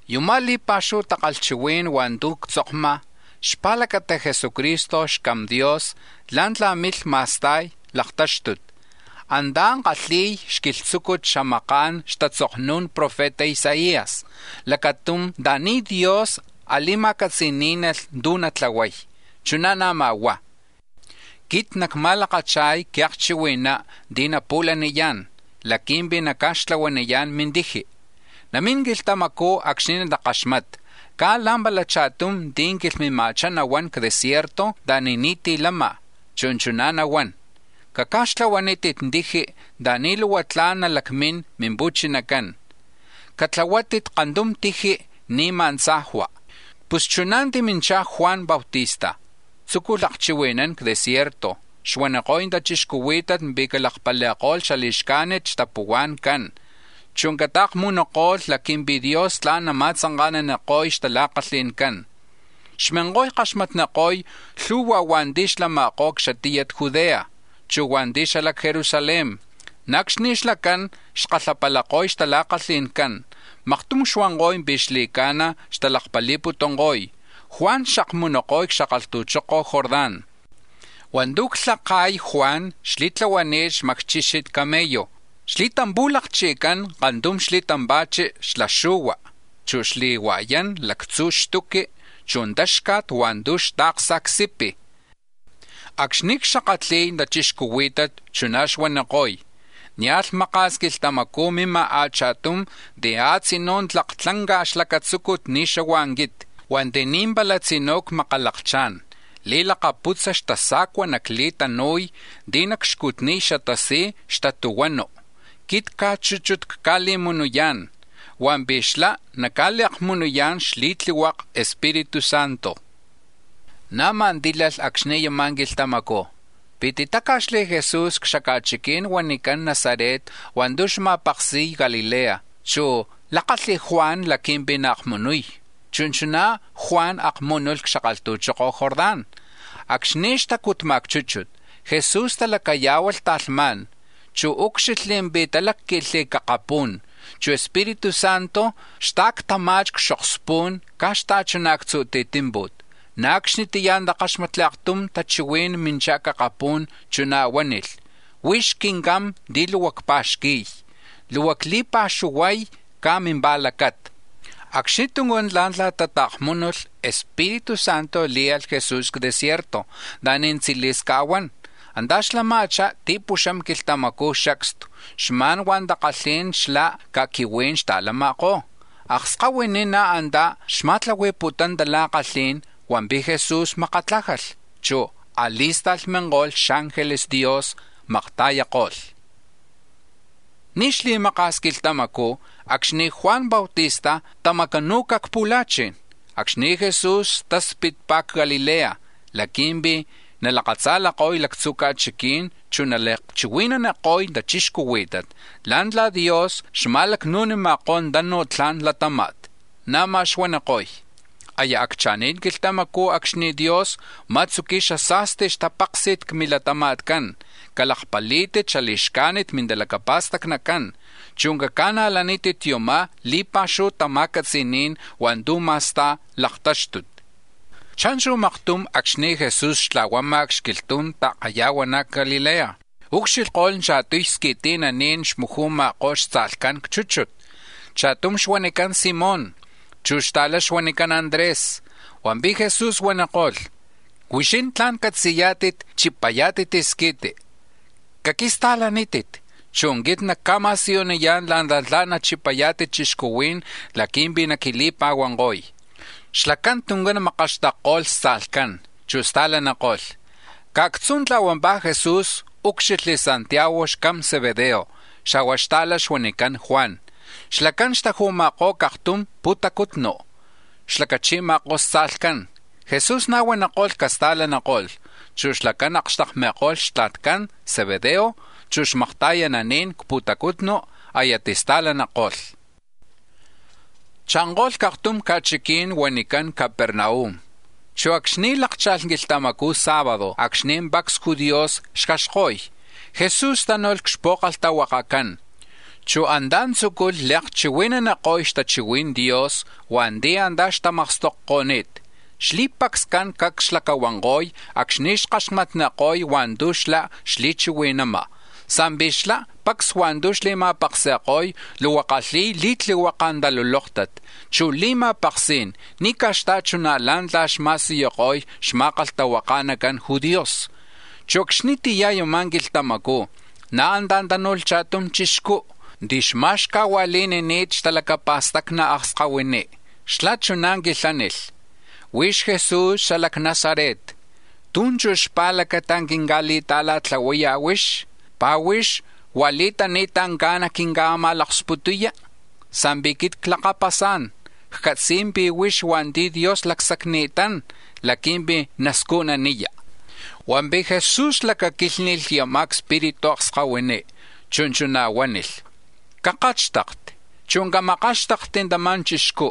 Yuma̱ li̱pa̱xuhu takalhchihuí̱n hua̱ntu̱ ctzokma̱ xpa̱lacata̱ Jesucristo xCam Dios la̱ntla̱ milh ma̱sta̱y laktáxtut, antá̱ kalhi̱y xquilhtzúcut c-xamaka̱n xtatzoknu̱n profeta Isaías lacatum anta̱ni̱ Dios a̱li̱ma̱catzi̱ní̱nalh tu̱ natlahuay, chuná̱ na̱má̱ huá̱: “Quit nacma̱lakacha̱y quiakchihui̱ná̱ ti̱ napu̱laniyá̱n laqui̱mpi̱ naca̱xtlahuaniyá̱n mintiji. Namín quilhtamacú̱ acxni̱ natakaxmata̱ caj la̱mpala cha̱tum ti̱ quilhmima̱chá nahuán c-desierto anta̱ni̱ ni̱tí̱ lama̱, chu̱ chuná̱ nahuán: ‘Caca̱xtlahuanítit tiji̱ anta̱ni̱ luhua tla̱n nalacmín Mimpu̱chinacán; catlahuanítit kantum tiji̱ ni̱ma̱ tzajua.’” Pus chuná̱ timinchá̱ Juan Bautista, tzúculh akchihui̱nán c-desierto, xuaniko̱y tachixcuhuí̱tat pi̱ calakpali̱ko̱lh xali̱xcajnit xtapuhua̱ncán, chu̱ cata̱kmunuko̱lh laqui̱mpi̱ Dios tla̱n nama̱tzanka̱naniko̱y xtala̱kalhi̱ncán. Xminko̱y kaxmatniko̱y lhu̱hua̱ hua̱nti̱ xlama̱kó̱ c-xatiyat Judea, chu̱ hua̱nti̱ xala c-Jerusalén. Na̱ acxni̱ xlacán xkalhapalako̱y xtala̱kalhi̱ncán, maktum xuanko̱y pi̱ xli̱ca̱na̱ xtalakpali̱putunko̱y, Juan xakmunuko̱y c-xakalhtu̱choko̱ Jordán. Hua̱ntu̱ xlhaka̱y Juan xli̱tlahuani̱t xmacchixit camello, xli̱tampu̱lakchi̱cán kantum xli̱tampa̱chi xla xu̱hua, chu̱ xli̱hua̱yán lactzu̱ xtuqui, chu̱ táxca̱t hua̱ntu̱ xta̱ksa̱ c-sipi̱. Acxni̱ cxakatli̱y tachixcuhuí̱tat chuná̱ xuaniko̱y: “Nia̱lh maka̱s quilhtamacú̱ mima̱ a̱cha̱tum ti̱ a̱tzinú̱ tlak tlanca̱ xlacatzúcut ni̱ xahua̱ quit; hua̱nti̱ ni̱ pala tzinú̱ cmakalakchá̱n li̱lakaputza xtasa̱cua nacli̱tanu̱y ti̱ nacxcutniy xatasij xtatuhuanu.” Quit caj chúchut cca̱li̱akmununi̱tán, hua̱mpi̱ xlá̱ naca̱li̱akmunuyá̱n xli̱tlihuaka Espíritu Santo. Na̱má̱ tílalh acxni̱ yama̱ quilhtamacú̱ pi̱ titáca̱xli̱ Jesús c-xca̱chiquí̱n huanicán Nazaret hua̱ntu̱ xma̱paksi̱y Galilea, chu̱ lákalh Juan laqui̱mpi̱ naakmunuy, chu̱ chuná Juan akmúnulh c-xakalhtu̱choko̱ Jordán. Acxni̱ xtacutma̱ c-chúchut, Jesús talacayá̱hualh talhmá̱n, chu̱ úcxilhli̱ pi̱ talácqui̱lh akapú̱n, chu̱ Espíritu Santo xta̱ctama̱chi̱ c-xokspún caj xta̱chuná̱ actzu̱ tijtímpu̱t, na̱ acxnitiyá̱ takáxmatli̱ aktum tachihuí̱n minchá̱ c-akapú̱n, chuná̱ huánilh: “Huix Quincam ti̱ luhua cpa̱xqui̱y, luhua cli̱pa̱xuhuay caj mimpa̱lacata.” Acxni tuncán la̱ntla̱ ta̱kmunuko̱lh, Espíritu Santo le̱lh Jesús c-desierto anta̱ni̱ tzili̱s ca̱huán. Antá̱ xlama̱chá̱ ti̱puxam quilhtamacú̱ xacstu, xma̱n hua̱ takalhí̱n xala ca̱quihuí̱n xta̱lama̱kó̱. Akskahuiní̱ na̱ antá̱ xma̱tlahui̱putún tala̱kalhí̱n hua̱mpi̱ Jesús makatlájalh, chu̱ a̱li̱sta̱lh minko̱lh xángeles Dios, maktakalhko̱lh. Ni̱ xli̱maka̱s quilhtamacú̱ acxni̱ Juan Bautista tamacanu̱ca̱ c-pu̱la̱chi̱n, acxnicú̱ Jesús taspitpá̱ c-Galilea laqui̱mpi̱ nalakatza̱lako̱y lactzu̱ ca̱chiquí̱n, chu̱ nali̱akchihui̱naniko̱y tachixcuhuí̱tat la̱ntla̱ Dios xma̱lacnu̱nima̱kó̱ tanuj tla̱n latáma̱t. Na̱má̱ xuaniko̱y: “Aya accha̱ni̱t quilhtamacú̱ acxni̱ Dios nama̱tzuqui̱y xasa̱sti xtapáksi̱t c-milatama̱tcán. Calakpalí̱tit xali̱xcajnit mintalacapa̱stacnicán, chu̱ caca̱najlátit yuma̱ li̱pa̱xuhu xtama̱catzi̱ní̱n hua̱ntu̱ ma̱sta̱y laktáxtut.” Cha̱nchu̱ maktum acxni̱ Jesús xtla̱huama̱ c-xquilhtu̱n ta̱kayahuaná̱ c-Galilea ucxilhko̱lh cha̱tuy squi̱ti̱naní̱n xmuju̱ma̱kó̱ xtza̱lhcán c-chúchut, cha̱tum huanicán Simón, chu̱ xta̱lá̱ huanicán Andrés. Hua̱mpi̱ Jesús huaniko̱lh: —Huixín tla̱n catzi̱yá̱tit chipayá̱tit squi̱ti, caquista̱lanítit, chu̱ quit nacca̱ma̱siyuniyá̱n la̱ntla̱ tla̱n nachipayá̱tit chixcuhuí̱n laqui̱mpi̱ naquili̱pa̱huanko̱y. Xlacán tuncán makaxtakko̱lh xtza̱lhcán, chu̱ sta̱laniko̱lh. Caj actzú̱ tla̱huampá̱ Jesús úcxilhli̱ Santiago xcam Zebedeo, xa̱hua̱ xta̱lá̱ xuanicán Juan; xlacán xtaju̱ma̱kó̱ c-aktum pu̱tacutnu, xlacachi̱ma̱kó̱ xtza̱lhcán. Jesús na̱ huaniko̱lh casta̱laniko̱lh, chu̱ xlacán akxtakmi̱ko̱lh xtla̱tcan Zebedeo, chu̱ xmakta̱yananí̱n c-pu̱tacutnu, aya tista̱laniko̱lh. Cha̱nko̱lh c-aktum ca̱chiquí̱n huanicán Capernaum, chu̱ acxni̱ lákcha̱lh quilhtamacú̱ sábado acxni̱ pacs judíos xjaxko̱y, Jesús tánu̱lh c-xpu̱kalhtahuakacán, chu̱ antá̱ tzúculh li̱akchihui̱naniko̱y xtachihui̱n Dios hua̱nti̱ antá̱ xtamakstokko̱ni̱t. Xli̱pacscán cacs xlacahuanko̱y acxni̱ kaxmatniko̱lh hua̱ntu̱ xlá̱ xli̱chihui̱nama̱, sa̱mpi̱ xlá, pacs hua̱ntu̱ xli̱ma̱paksi̱ko̱y, luhua kalhi̱y li̱tlihuaka̱ talulóktat, chu̱ li̱ma̱paksí̱n, ni̱ caj xta̱chuná̱ la̱ntla̱ xma̱siyuko̱y xma̱kalhtahuaka̱nacan judíos. Chu̱ acxnitiyá̱ yama̱ quilhtamacú̱ na̱ antá̱ tánu̱lh cha̱tum chixcú̱ ti̱ xma̱xcajua̱li̱nini̱t xtalacapa̱stacni̱ akskahuiní. Xlá̱ chuná̱ quilhánilh: —Huix Jesús xala c-Nazaret, ¿tú̱ chú̱ xpa̱lacata̱ quinca̱li̱ta̱la̱tlahuaya̱ huix? ¿Pi̱ huix huá̱ li̱tani̱ta̱ caj quinca̱ma̱sputuya? Sa̱mpi̱ quit clakapasá̱n, ccatzi̱y pi̱ huix hua̱nti̱ Dios lacsacni̱tán laqui̱mpi̱ nascujnaniya. Hua̱mpi̱ Jesús lacaquílhni̱lh yama̱ cspiritu akskahuiní, chu̱ chuná̱ huánilh: —¡Cakátxtakti, chu̱ camakáxtakti̱ tama̱ chixcú!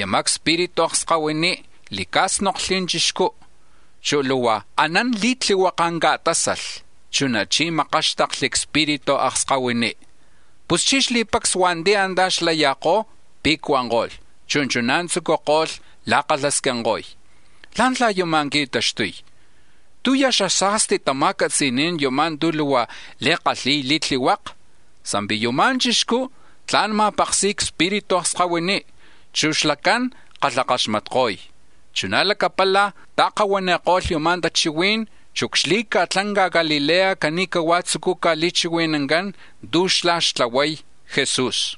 Yama̱ cspiritu akskahuiní̱ li̱cá̱snokli̱ chixcú, chu̱ luhua anán li̱tlihuaka̱ ca̱tásalh, chunachí̱ makáxtakli̱ cspiritu akskahuiní. Puschí̱ xli̱pacs hua̱nti̱ antá̱ xlaya̱kó̱ pe̱cuanko̱lh, chu̱ chuná̱ tzúculh la̱kalhasquinko̱y: —¿Lá̱ntla̱ yuma̱ qui̱taxtuy? ¿Tú̱ ya̱ xasa̱sti tacatzí̱n yumá̱ tu̱ luhua li̱kalhi̱y li̱tlihuaka? ¡Sa̱mpi̱ yuma̱ chixcú̱ tla̱n ma̱paksi̱ko̱y cspiritu akskahuiní, chu̱ xlacán kalhakaxmatko̱y! Chuná̱ lacapala̱ ta̱kahuáni̱lh tachihuí̱n, chu̱ c-xli̱ca̱tlanca Galilea cani̱cahuá̱ tzucúcaj li̱chihui̱nancán tu̱ xlá̱ xtlahuay Jesús.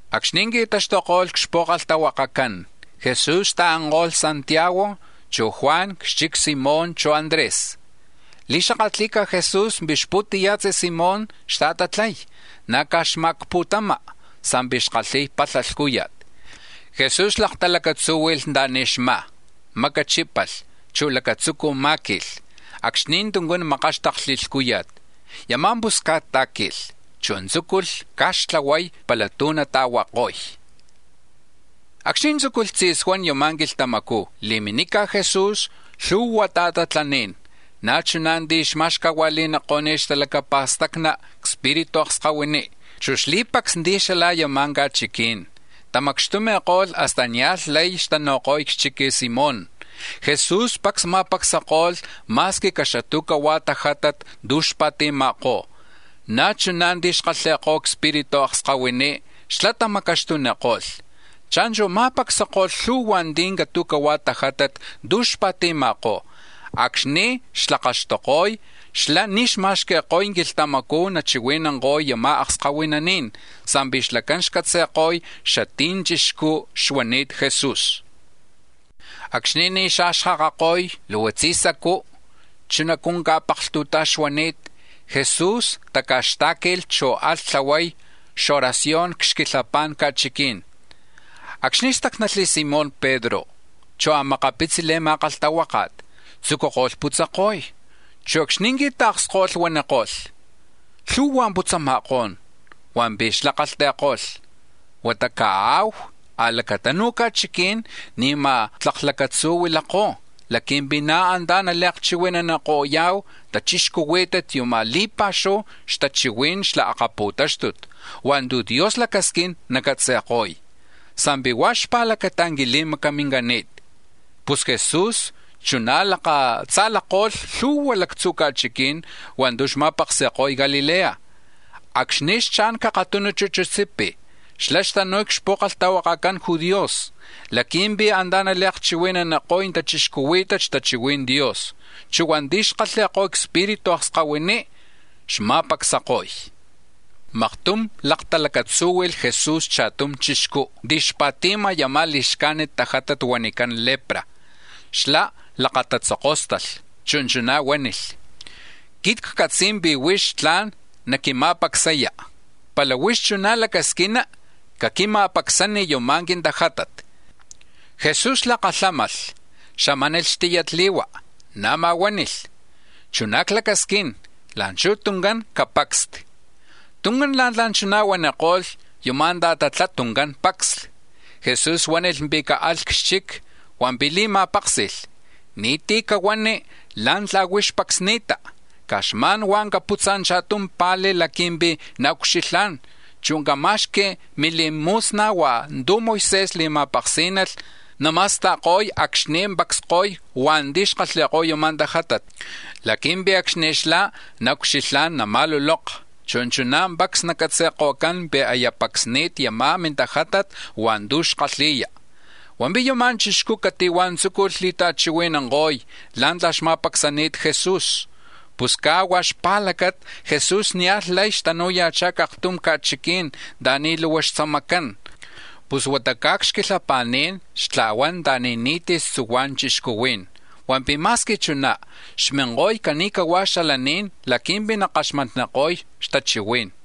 Acxni̱ qui̱taxtuko̱lh c-xpu̱kalhtahuacán, Jesús ta̱anko̱lh Santiago, chu̱ Juan c-xchic Simón, chu̱ Andrés. Li̱xakatli̱ca̱ Jesús pi̱ xpu̱tiya̱tzi Simón xta̱tatlay, na̱ caj xmá̱ c-xpu̱tama, sa̱mpi̱ xkalhi̱y palha lhcúya̱t. Jesús laktalacatzúhui̱lh anta̱ni̱ xmá̱, macachípalh, chu̱ lacatzucu̱ má̱qui̱lh, acxni tuncán makáxtakli̱ lhcúya̱t. Yama̱ pusca̱t tá̱qui̱lh, chu̱ tzúculh ca̱xtlahuay pala tú̱ nata̱huako̱y. Acxni̱ tzúculh tzi̱suán yama̱ quilhtamacú̱ li̱minica̱ Jesús lhu̱hua ta̱tatlaní̱n, na̱ chuná̱ ti̱ xma̱xcajua̱li̱niko̱ni̱t xtalacapa̱stacni̱ cspiritu akskahuiní. Chu̱ xli̱pacs ti̱ xala yama̱ ca̱chiquí̱n tamacxtumi̱ko̱lh hasta nia̱lh lay xtanu̱ko̱y c-xchic Simón. Jesús pacs ma̱pacsako̱lh ma̱squi caxatu̱cahua̱ tajátat tu̱ xpa̱ti̱ma̱kó̱, na̱ chuná̱ ti̱ xkalhi̱ko̱y cspiritu akskahuiní, xlá̱ tamacaxtuniko̱lh. Cha̱nchu̱ ma̱pacsako̱lh lhu̱hua̱ ti̱ catu̱hua̱ tajátat tu̱ xpa̱ti̱ma̱kó̱. Acxni̱ xtlakaxtuko̱y, xlá̱ ni̱ xma̱xqui̱ko̱y quilhtamacú̱ nachihui̱nanko̱y yama̱ akskahuinaní̱n, sa̱mpi̱ xlacán xcatzi̱ko̱y xatí̱ ya̱ chixcú xuani̱t Jesús. Acxni̱ ni̱ xa̱xkakako̱y, luhua tzisacú̱, chunacú̱ ca̱paklhtu̱taj xuani̱t, Jesús taca̱xtá̱qui̱lh, chu̱ alh tlahuay oración c-xquilhapa̱n ca̱chiquí̱n. Acxni̱ stácnalh Simón Pedro, chu̱ a̱makapitzi̱ xli̱ma̱kalhtahuáka̱t tzucuko̱lh putzako̱y. Chu̱ acxni̱ qui̱ta̱ksko̱lh, huaniko̱lh: —Lhu̱hua̱ putzama̱kó̱n. Hua̱mpi̱ xlá̱ kalhti̱ko̱lh: —Huata caanka̱hu a̱lacatanu̱ ca̱chiquí̱n ni̱ma̱ tlak lacatzú̱ huilakó̱ laqui̱mpi̱ na̱ antá̱ nali̱xakatli̱ko̱ya̱hu tachixcuhuí̱tit yuma̱ li̱pa̱xuhu tachihuí̱n xla laktáxtut hua̱ntu̱ Dios lacasquín nacatzi̱ko̱y, sa̱mpi̱ huá̱ xpa̱lacata quili̱macamini̱t. Pus Jesús chuná̱ lakatza̱lako̱lh lhu̱hua lactzu̱ ca̱chiquí̱n hua̱ntu̱ xma̱paksi̱ko̱y Galilea. Acxni̱ xcha̱n c-aktum chuchutsipi̱, xlá̱ xtanu̱y c-xpu̱kalhtahuacan judíos laqui̱mpi̱ antá̱ nali̱akchihui̱naniko̱y tachixcuhuí̱tat xtachihui̱n Dios, chu̱ hua̱nti̱ xkalhi̱y cspiritu akskahuiní̱ xma̱pacsako̱y. Maktum laktalacatzúhui̱lh Jesús cha̱tum chixcú̱ ti̱ xpa̱ti̱ma̱ yama̱ li̱xcajnit tajátat huanicán lepra. Xlá̱ lakatatzokóstalh, chu̱ chuná̱ huánilh: —Quit ccatzi̱y pi̱ huix tla̱n naquima̱pacsaya, pala huix chuná̱ lacasquina, caquima̱pacsani̱ yuma̱ quintajátat. Jesús lakalhámalh, xamánilh xmacni, na̱má̱ huánilh: —Chuná̱ clacasquín, la̱nchuj tuncán capacsti. Tuncán la̱ntla̱ chuná̱ huaniko̱lh, yama̱ ta̱tatlá̱ tuncán pacsli. Jesús huánilh pi̱ caalh c-xchic, hua̱mpi̱ li̱ma̱páksi̱lh: —Ni̱tí̱ cahuani̱ la̱ntla̱ huix pacsni̱ta; caj xma̱n caputza̱ cha̱tum pa̱li̱ laqui̱mpi̱ naucxilhá̱n, chu̱ cama̱xqui̱ milimu̱sna̱ hua̱ntu̱ Moisés li̱ma̱paksí̱nalh nama̱sta̱ko̱y acxni̱ pacsko̱y hua̱nti̱ xkalhi̱ko̱y yuma̱ tajátat, laqui̱mpi̱ acxni̱ xlá̱ naucxilhá̱n, nama̱luloka, chu̱ chuná̱ pacs nacatzi̱ko̱cán pi̱ aya pacsni̱ta̱ yama̱ li̱xcajnit mintajátat hua̱ntu̱ xkalhi̱ya. Hua̱mpi̱ yama̱ chixcú̱ cati̱huá̱ tzúculh li̱ta̱chihui̱nanko̱y la̱ntla̱ xma̱pacsani̱t Jesús. Pus caj huá̱ xpa̱lacata, Jesús nia̱lh lay xtanu̱ya̱chá̱ c-aktum ca̱chiquí̱n anta̱ni̱ lu̱hua̱ xtzamacán, pus huata caj c-xquilhapa̱ní̱n xtla̱huán anta̱ni̱ ni̱tí̱ xtzuhuá̱n chixcuhuí̱n. Hua̱mpi̱ ma̱squi chuná, xminko̱y cani̱hua̱ xalaní̱n laqui̱mpi̱ nakaxmatniko̱y xtachihuí̱n.